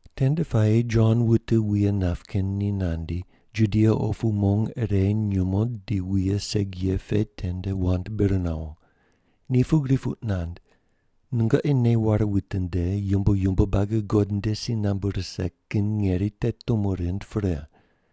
Tende puayi Jon wute wuye nap kin ni nandi, Judia opu mong ire nyumo di wuye segi ye pe tende wand bir nawo. Ni pugri puq nand, “Nungoqi nei ware witinde, yumbo yumbo buagi God nde si nambu rise kin ngeri te tumo rind pre.”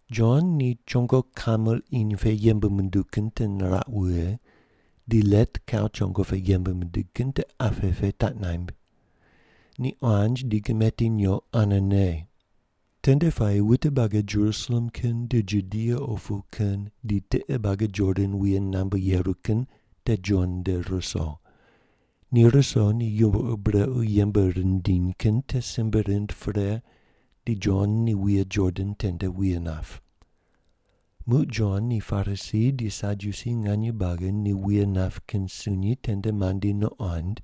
Jon ni chongo kamel iny pe yembe munduw kin te niraq wughe, di let kau chongo pe yembe mindig kin te apqe pe taq naimb. Ni quanj di gimeti nyoq ane ne. Tende puayi wute buagi Jerusalem kin di Judia opu kin di tiqe buagi Jordan wuye qunambe yeru kin te Jon nde ruso. Ni ruso ni yumbo ur brequ yembe rindiny kin te simbe rind pre di Jon ni wuye Jordan tende wuye nap. Muq Jon ni Parisi di Sadyusi nganye buagi ni wuye nap kin sunyi tende mandi nuqond,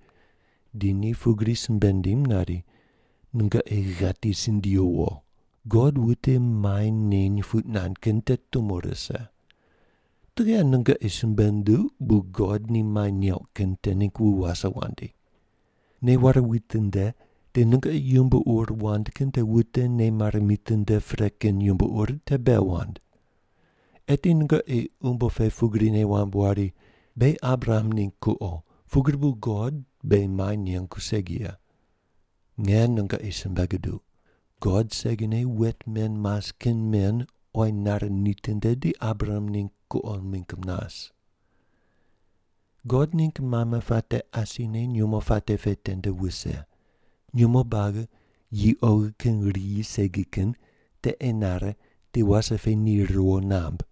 di ni pugri simbe nindim nari, “Nungoqi ghati sindiyu wo! God wute mai neny puq nand kin te tumo rise. Tughe nungoqi simbe nunduq bu God ni mai neuq kin te ningg wu wase wandi? Nei ware witinde, di nungoqi yumbo ur wand kin te wute nei mare mitinde pre kin yumbo ur te bei wand. Eti nungoqi umbo pe pugri nei wamb wari, ‘Beghi Abraham ningg kuqo, pugri bu God beghi mai nengu segi ye.’ Nge nungoqi simbe guduq, God segine wet men mas kin men oyi nare nitinde di Abraham ningg kuqo mingg mas. God ningg mame puate asine nyumo puate pe tende wuse, nyumo buagi yi oghi kin riyi segi kin te enare di wase pe ni riwo namb.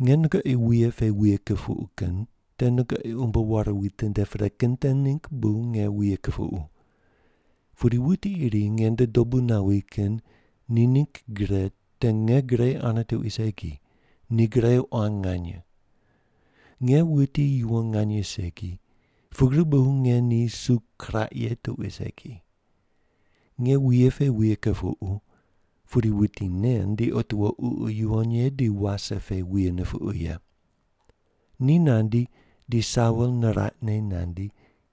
“Nge nungoqi wuye pe wuye kupuqu kin te nungoqi umbo ware witinde pre kin te ningg bu nge wuye kupuqu. Pudi wuti iri nge nde dobu nawi kin ni ningg gre te nge gre ane tuqui segi, ni gre quan nganye. Nge wuti yuwon nganye segi, pugri bu nge ni su kiraq ye tuqui segi. Nge wuye pe wuye kupuqu, pudi wuti nen di nungoqi Ququ Yuwon Ye di wase pe wuye nupuqu ye. Ni nandi di sawol niraqne nandi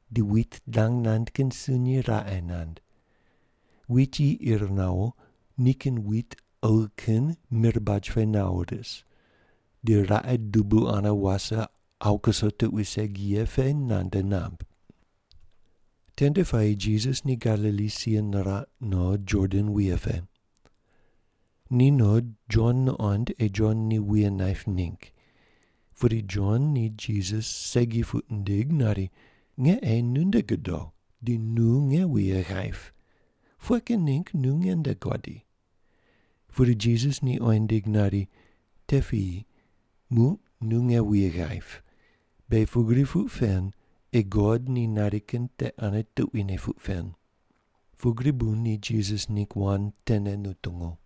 di wit dang nand kin sunyi raqe nand. Wit yi ir nawo, nikin wit oghi kin mir baj pe nawo ris, di raqe dubu ane wase awu kuso tuqui segi ye pe nande namb.” Tende puayi Jisas ni Galili si niraq no Jordan wuye pe. Ni no Jon nuqoind ei Jon ni wuye naip ningg. Pudi Jon ni Jisas segi puq nindig nari, “Nge ei nu nde godo di nu nge wuye ghaip, pughe kin ningg nu nge nde guadi?” Pudi Jisas ni oyi nindig nari, “Te piyi, muq nu nge wuye ghaip. Beghi pugri puq pen ei God ni nari kin te ane tuquine puq pen.” Pugri bu ni Jisas ningg wand tene nutungu.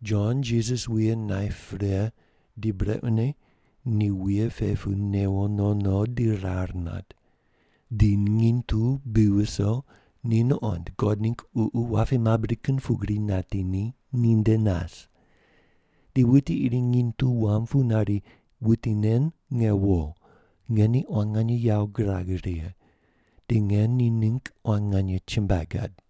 Jon Jisas wuye naip pre di brequne ni wuye pe pu newo no no di rar nat. Di nginy tu bi viso, ni nuqond God ningg Ququ wapi mabri kin pugri nati ni, ni nde nas. Di wuti iri nginy tu wam pu nari, “Wuti nen nge wo. Nge ni quan nganye yawo girag righe, di nge ni ningg quan nganye chumbuai gad.”